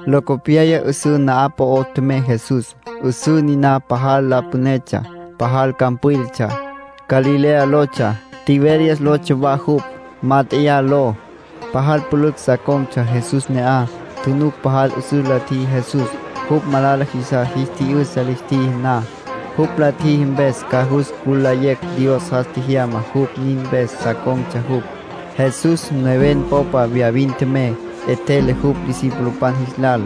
Locopyaya 'üsǘ na'aj po'o tjemey Jesús. 'Üsǘ niná pajal la pünetsja, pajal campwílatsja. Galilea lotsja. Tiberias lotsja wa jupj. Mát'eya ló. Pajal pülücj sa con̈tsja Jesús ne'aj. Tjunuc pajal 'üsüs la tjiji Jesús, jupj malala jisas jis tji'yü'sa lis tjiji na. Jupj la tjiji mpes ca jus cülayecj Dios jas tjejyama jupj. Nin mpes sa con̈tsja jupj. Jesús neven popa viyavin tjemey. 'Etjele jupj discipulopan jis lal.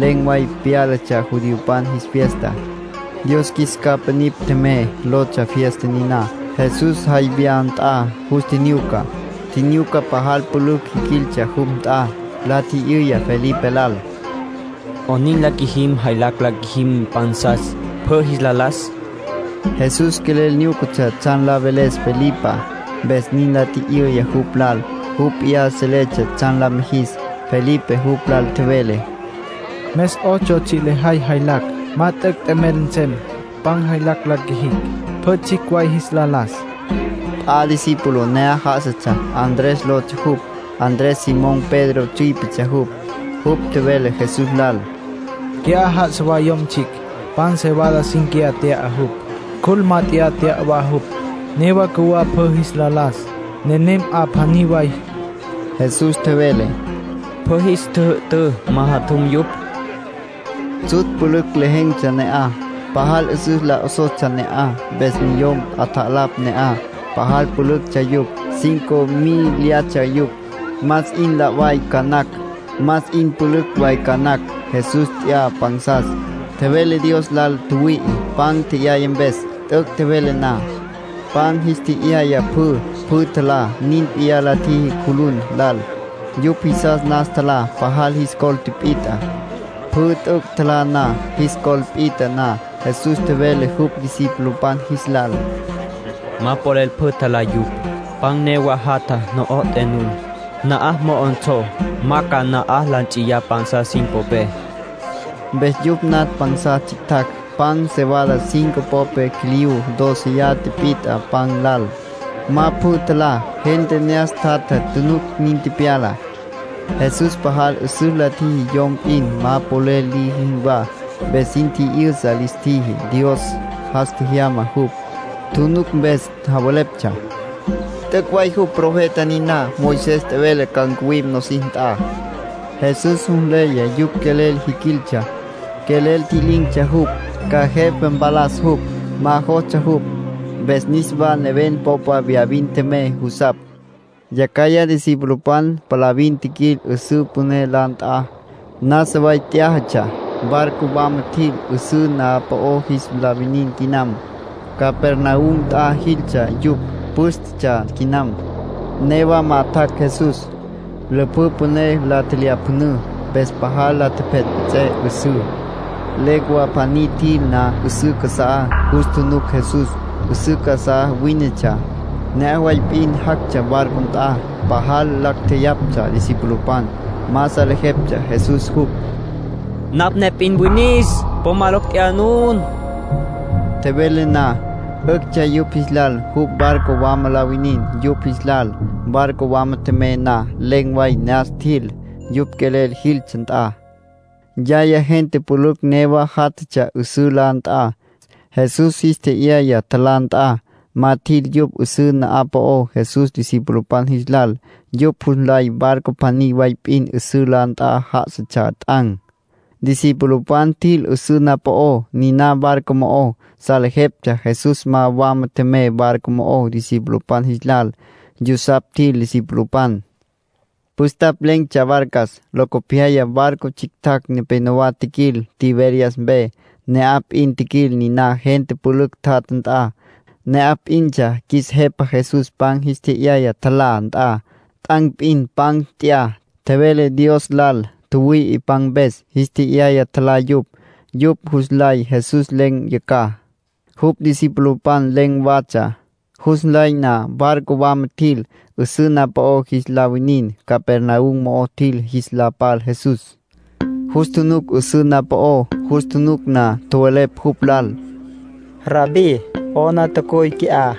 Len̈ way pyálatsja judiopan jis fiesta. “Dios Qjuis Capa Nipj Tjemey” lotsja fiesta niná. Jesús jay viyá nt'ya, yus tjinyuca. Tjinyuca pajal pülücj jiquiltsja jupj nt'a. La tji'yüya Felipe lal: —¿'Onin la qjuijim jaylacj la qjuijim pansas, pjü jis la las? Jesús quelel nyúcatsja tsjan la veles Felipá, mpes nin la tji'yüya jupj lal. Jupj p'iyá seletsja tsjan la mijis. Felipe jupj lal tjevele: —Mes ocho tsji' lejay jaylacj, ma t'üc' t'emel nsem pan jaylacj la qjuijicj, pjü tsjicj way jis la las. P'a discípulo ne'aj já'asatsja, Andrés lotsja jupj. Andrés Simón Pedro tsüípetsja jupj. Jupj tjevele Jesús lal: —Qui'á já'asa wa yom tsjicj. Pan cebada cínquiya tya'a jupj. Cjul mát'eya tya'a wa jupj. Newa cjuwá pjü jis la las. Nenem 'a pjaní way. Jesús tjevele: —Pjü jis tjüjü'tǘ majatjum yupj. Tsjutsj pülücj lejen̈tsja ne'aj, pajal 'üsüs la 'osostsja ne'aj. Mpes niyom 'atjalapj ne'aj. Pajal pülüctsja yupj, cinco mílyatsja yupj. Más 'in la' way ca nacj, más 'in pülücj way ca nacj. Jesús nt'ya pansas, tjevele Dios lal tjüwüi'i pan tje'yaya mpes. T'üc' tjevele na, pan jis tje'yaya pjü. Pjü tjalá. Nin p'iyá la tjiji cjulun lal. Yupj jisas nas tjalá. Pajal jis col tipit'a. Pjü t'üc' tjalá na, jis col pit'a na, Jesús tjevele jupj discipulopan jis lal: —Ma polel pjü tjalá yupj. Pan newa jatja no'oté nun. Na'aj mo'onsó, ma ca na'aj la nts'iyá pansas sin popé. Mpes yupj natj pansas tsjictjacj. Pan cebada cinco popé quiliyú dóceya tipit'a pan lal, ma pjü tjalá. Gente ne'aj tjatja tjunuc nin tepyalá. Jesús pajal 'üsüs la tjiji yom p'in ma polel liji jinwá, mpes sin tji'yüsa lis tjiji Dios jas tjejyama jupj. Tjunuc mpes javeleptsja: “T'üc' way jupj profeta niná Moisés tjevele ca ncuwim nosis nt'a”. Jesús jus nleya yupj quelel jiquiltsja, quelel tji'lin̈tsja jupj, ca jepa mpalas jupj. Ma jostsja jupj. Mpes niswa neven popa viyavin tjemey jusapj. Yacjaya discipulopan palavin tjiquil 'üsǘ püné la nt'a. Nasa way t'yájatsja. Barco wama tjil, 'üsǘ na'aj po'ó jis la winin quinam. Capernaum nt'a jiltsja yupj. Pǘstetsja quinam, newá ma tjac' Jesús. Lüpjǘ püné la tjelyapjünǘ, mpes pajal la tjepjetpjets'é 'üsǘ. Legua pjaní tjil na 'üsǘ casa'á, jus tjunuc Jesús. 'Üsǘ casá wínetsja, ne'aj way p'in jactsja barco nt'a. Pajal lacj tjeyaptsja discipulopan. Ma salejeptsja Jesús jupj. “Napj ne p'in winis. Po ma locj tjeyá nun”, tjevele jupj. Tjevele na, 'üctsja yupj jis lal jupj barco wama la winin yupj jis lal. Barco wama tjemey na, len̈ way ne'as tjil, yupj quelel jiltsja nt'a. Yaya gente pülücj newa játjatsja 'üsǘ la nt'a, Jesús jis tje'yaya tjalá nt'a. Ma tjil yupj 'üsǘ na'aj po'ó Jesús discipulopan jis lal. Yupj jus nlay barco pjaní way p'in 'üsǘ la nt'a já'asatsja t'an̈. Discipulopan tjil 'üsǘ na'aj po'ó niná barco mo'ó. Salejeptsja Jesús ma wama tjemey barco mo'ó discipulopan jis lal. Yusapj tjil discipulopan. Püstapj len̈tsja barcas. Locopyaya barco tsjictjacj nepénowa tjiquil Tiberias mpe. Ne'aj p'in tjiquil niná gente pülücj tjatja nt'a, ne'aj p'intsja qjuis Jepa Jesús pan jis tje'yaya tjalá nt'a. (T'an̈ p'in pan nt'ya, tjevele Dios lal tjüwüi'i pan mpes. Jis tje'yaya, tjalá yupj.) Yupj jus nlay Jesús len̈ yacjaj, jupj discipulopan len̈ watsja. Jus nlay na, barco wama tjil, 'üsǘ na'aj po'ó jis la winin. Capernaum mo'o tjil jis la pal Jesús. Jus tjunuc 'üsǘ na'aj po'ó. Jus tjunuc na, tjowelepj jupj lal: —Rabbí, ¿'ona tjacuy qui'á?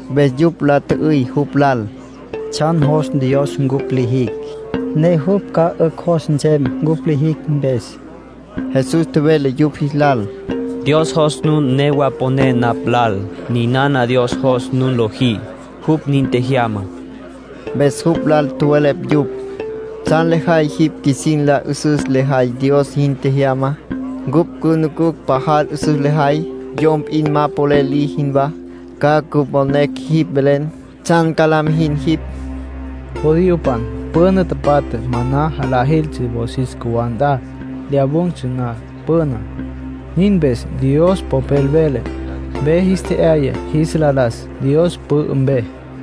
Mpes yupj la tjü'üy jupj lal: —¿Tsjan jos Dios cupj lijicj, ne jupj ca 'ücj jos nsem cupj lijicj mpes? Jesús tjevele yupj jis lal: —Dios jos nun newa poné napj lal. Ninana Dios jos nun lojí. Jupj nin tjejyama. Mpes jupj lal tjowelepj yupj: —¿Tsjan lejay jipj qjuisin la 'üsüs lejay Dios jin tjejyamá? Cupj cünucucj pajal 'üsüs lejay, yom p'in ma polel liji jinwá, ca cüponecj jipj velen. ¿Tsjan ca la mijin jipj? Judiopan püna tapatja maná jalá jiltsja wosis cjuwá nt'a lyawun̈tsja na püná. Nin mpes Dios Popel vele: ‘Ve jis tje'yaya jis la las Dios pü'ü mpe’.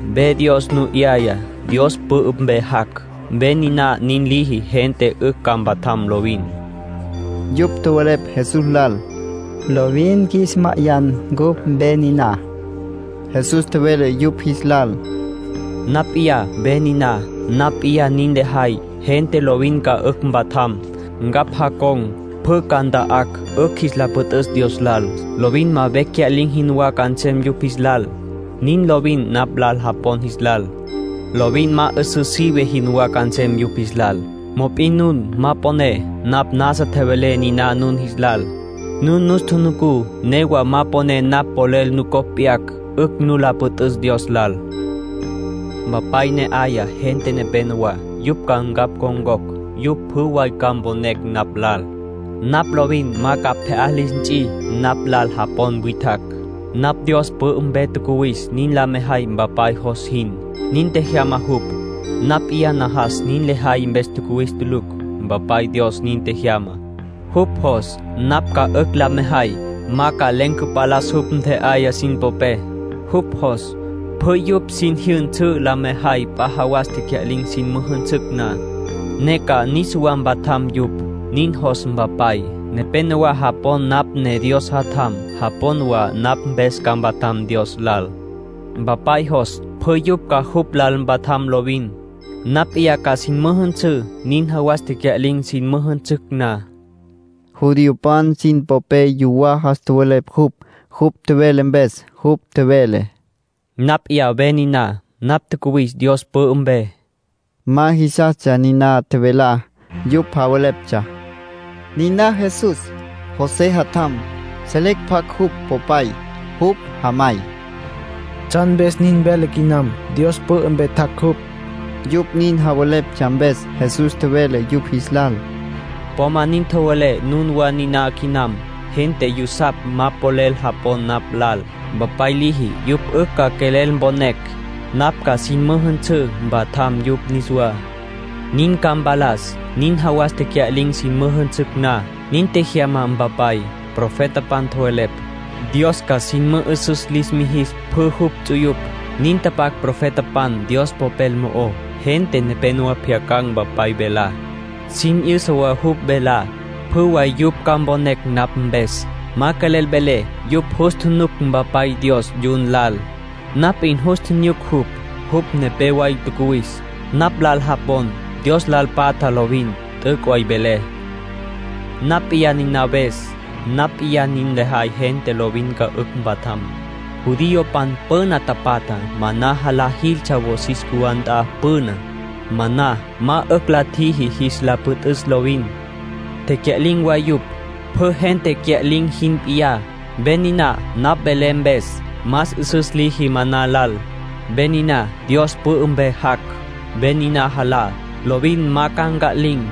Ve Dios nu 'yayá, Dios pü'ü mpe jac'. Ve niná nin liji gente 'ücj ca mpatjam lovin. Yupj tjowelepj Jesús lal: —Lovin qjuis ma'ayan ncupj ve niná. Jesús tjevele yupj jis lal: —Napj p'iyá ve niná. Napj p'iyá nin lejay gente lovin ca 'ücj mpatjam. Ncapj jacon̈ pjü ca nta'acj 'ücj jis la püt'üs Dios lal. Lovin ma vecj cya'lin̈ jinwá ca nsem yupj jis lal. Nin lovin napj lal japon jis lal. Lovin ma 'üsǘ sive jinwá ca nsem yupj jis lal. Mop'in nun ma poné. Napj nasa tjevelé niná nun jis lal. Nun nus tjunucú, newa ma poné napj polel nucopj p'yacj 'ücj nu la püt'üs Dios lal. ”Mpapay ne 'aya gente nepenowá, yupj ca ncapj ncon̈cocj. Yupj pjü way ca mponecj napj lal. Napj lovin ma ca pje'á lis nts'i napj lal japon witjacj. Napj Dios pü'ü mpe tjacuwis nin la mejay Mpapay jos jin. Nin tjejyama jupj. Napj p'iyá najas jin lejay mpes tjacuwis tulucj. Mpapay Dios nin tjejyama. Jupj jos napj ca 'ücj la mejay ma ca len̈ cüvalas jupj ntje'ayá sin popé. Jupj jos pjü yupj sin jyünsǘ la mejay p'a jawas tecya'lin̈ sin müjünsücj na, ne ca niswa mpatjam yupj. Nin jos Mpapay. Nepénowa japon napj ne Dios Jatjam. Japon wa napj mpes ca mpatjam Dios lal. Mpapay jos pjü yupj ca jupj lal mpatjam lovin. Napj p'iyá ca sin müjünsǘ nin jawas tecya'lin̈ sin müjünsücj na —nin tjevele Jesús. Judiopan sin popé yuwá jas tjowelepj jupj, jupj tjevele mpes. Jupj tjevele: “Napj p'iyá ve niná. Napj tjacuwis Dios pü'ü mpe.” Ma jisastsja niná tjevelá. Yupj javeleptsja: “Niná Jesús, José jatjam. Selecj pjacj jupj popay, jupj jamay. ¿Tsjan mpes nin vele quinam, Dios pü'ü mpe tjac' jupj?” Yupj nin javeleptsja mpes, Jesús tjevele yupj jis lal: —Po ma nin tjowelé nunwá niná quinam. Gente yusapj ma polel japon napj lal. Mpapay liji yupj 'ücj ca quelel mponecj. Napj ca sin müjünsǘ mpatjam yupj niswá. Nin ca mpalas nin jawas tecya'lin̈ sin müjünsücj na. Nin tjejyama Mpapay. Profetapan tjowelepj: ‘Dios ca sin mü'üsüs lis mijis pjü jupj ts'uyupj’. Nin tapac profetapan Dios Popel mo'ó. Gente nepénowa pjyacan̈ Mpapay velá, sin 'yüsa wa jupj velá. Pjü way yupj ca mponecj napj mpes. ”Ma quelel velé yupj jus tjunuc Mpapay Dios, yun lal. Napj p'in jus tjinyuc jupj. Jupj nepé way tjacuwis. Napj lal japon, Dios lal patja lovin. T'üc' way velé. Napj p'iyá niná ves. Napj p'iyá nin lejay gente lovin ca 'ücj mpatjam. ”Judiopan püna tapatja maná jalá jiltsja wosis cjuwá nt'a püná. Maná ma 'ücj la tjiji jis la püt'üs lovin. Tecya'lin̈ wa yupj, pjü gente cya'lin̈ jin p'iyá. Ve niná napj velé mpes, más 'üsüs liji maná lal. Ve niná Dios pü'ü mpe jac'. Ve niná jalá, lovin ma ca nca'lin̈.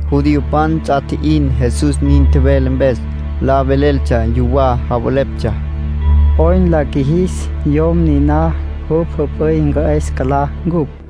Judiopan ts'a tji'in Jesús nin tjevele mpes. La veleltsja yuwá. Javeleptsja: “¿'Oyn la qjuijis yom niná, jupj jüp'üy cü'es cülá ncupj?”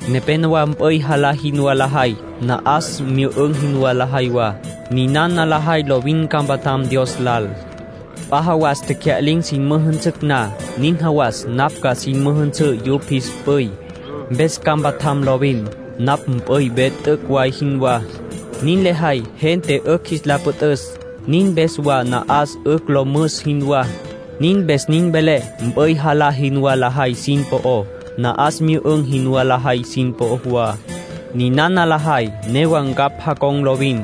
”Nepénowa mp'üy jalá jinwá lajay, na'as myü'ün̈ jinwá lajay wa. Ninana lajay lovin ca mpatjam Dios lal. P'a jawas tecya'lin̈ sin müjünsücj na, nin jawas napj ca sin müjünsǘ yupj jis p'üy, mpes ca mpatjam lovin. Napj mp'üy ve t'üc' way jinwá. Nin lejay gente 'ücj jis la püt'üs. Nin mpes wa na'as 'ücj lo müs jinwá. Nin mpes nin velé mp'üy jalá jinwá lajay sin po'ó, na'as myü'ün̈ jinwá lajay sin po'ó wa. Ninana lajay newa ncapj jacon̈ lovin.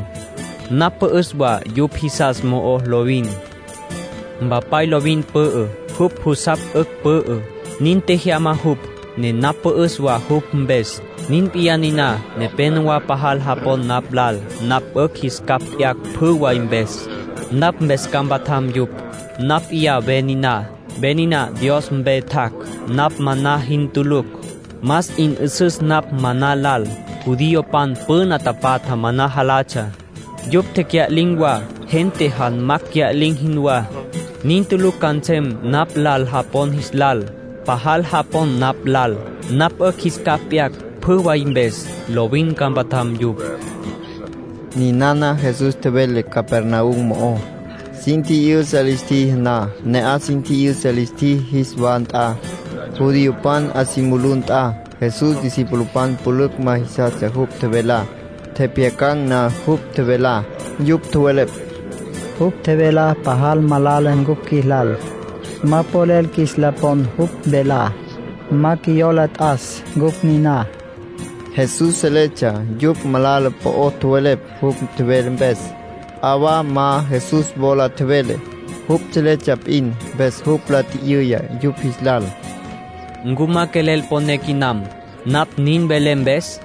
Napj pü'üs wa yupj jisas mo'ó lovin. Mpapay lovin pü'ü. Jupj jusapj 'ücj pü'ü. Nin tjejyama jupj, ne napj pü'üs wa jupj mpes. Nin p'iyá niná. Nepénowa pajal japon napj lal, napj 'ücj jis capj p'yacj pjü way mpes. Napj mpes ca mpatjam yupj. Napj p'iyá ve niná, ve niná Dios mpe tjac'. Napj maná jin tulucj. Más 'in 'üsüs napj maná lal. Judiopan püna tapatja maná jalatsja. Yupj tecya'lin̈ wa, gente janmacj cya'lin̈ jinwá. Nin tulucj ca nsem napj lal japon jis lal. Pajal japon napj lal, napj 'ücj jis capj p'yacj pjü way mpes, lovin ca mpatjam yupj. Ninana Jesús tjevele Capernaum mo'ó, sin tji'yüsa lis tjiji na. Ne'aj sin tji'yüsa lis tjiji jis wa nt'a, judiopan 'a si mulú nt'a. Jesús discipulopan pülücj ma jisastsja jupj tjevelá. Tjepjyacan̈ na jupj tjevelá, yupj tjowelepj: “Jupj tjevelá pajal malala cupj qjuilal. Ma polel qjuis la pon jupj velá. Ma qjuiyola t'as ncupj niná.” Jesús seletsja yupj malala po'o tjowelepj jupj tjevele mpes. P'a wa ma Jesús wola tjevele; jupj seletsja p'in. Mpes jupj la tji'yüya yupj jis lal: —¿Ncu ma quelel poné quinam, napj nin velé mpes?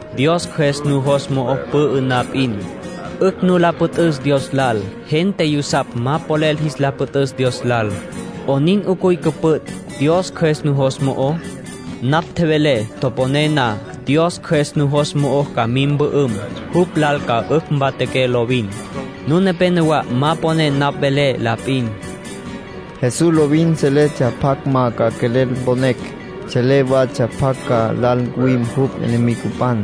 Dios Cjües nujos mo'o pü'ü na p'in, 'ücj nu la püt'üs Dios lal. Gente yusapj ma polel jis la püt'üs Dios lal. ¿'Onin 'ucuy cüpüt' Dios Cjües nujos mo'ó? Napj tjevelé toponé na, Dios Cjües nujos mo'o ca mim mpü'üm. Jupj lal ca 'ücj mpatjaqué lovin. Nun nepenowá ma poné napj velé la p'in —nin tjevele Jesús. Jesús lovin seletsja pjacj ma ca quelel mponecj. Selé watsja pjacj ca lal ncuwim jupj enemigopan,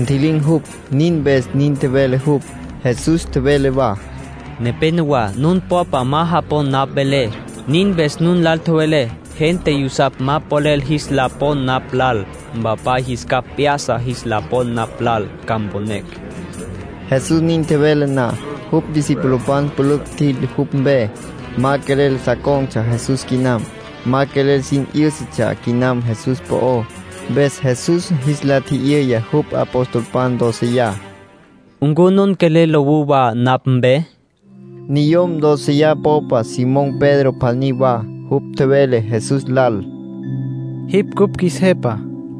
ntji'lin̈ jupj. Nin mpes nin tjevele jupj. Jesús tjevele wa: —Nepénowa nun popa ma japon napj velé. Nin mpes nun lal tjevelé gente yusapj ma polel jis la pon napj lal. Mpapay jis capj p'ya'sa jis la pon napj lal, ca mponecj. Jesús nin tjevele na, jupj discipulopan pülücj tjil jupj mpe. Ma quelel sa con̈tsja Jesús quinam. Ma quelel sin 'yǘsatsja quinam Jesús po'ó. Mpes Jesús jis la tji'yüya jupj apostolpan doceyá: —¿Ncu nun quelel lowú wa napj mpe? Niyom dóceya popa Simón Pedro pjaní wa. Jupj tjevele Jesús lal: —Jipj cupj qjuis Jepa.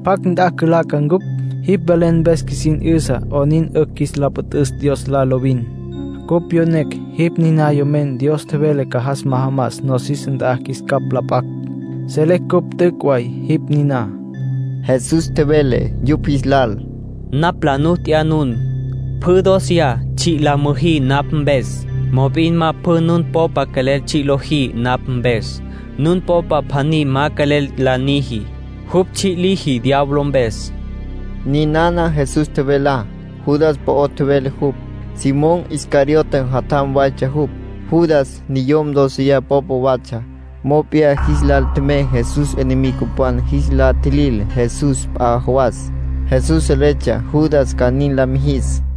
¿Pjacj nt'a cülaca ncupj? Jipj velen mpes qjuisin 'yüsa 'onin 'ücj qjuis la püt'üs Dios lal lovin. Cupj pyonecj jipj niná Yomen Dios tjevele ca jas majamas nosis nt'a qjuis capj la p'acj. Selecj cupj t'üc' way jipj niná. Jesús tjevele yupj jis lal: —Napj la nu t'ya nun, pjü dóceya, tsji' la müjí napj mpes. Mop'in ma pjü nun popa quelel tsji' lojí napj mpes. Nun popa pjaní ma quelel la niji. Jupj tsji' liji diablo mpes. Ninana Jesús tjevelá, Judas po'ó tjevele jupj. Simón Iscariote jatjam waytsja jupj, Judas. Niyom dóceya popa watsja, mop'iyá jis lal tjemey Jesús enemigopan jis la tjilil Jesús p'a jawas. Jesús seletsja Judas ca nin la mijis.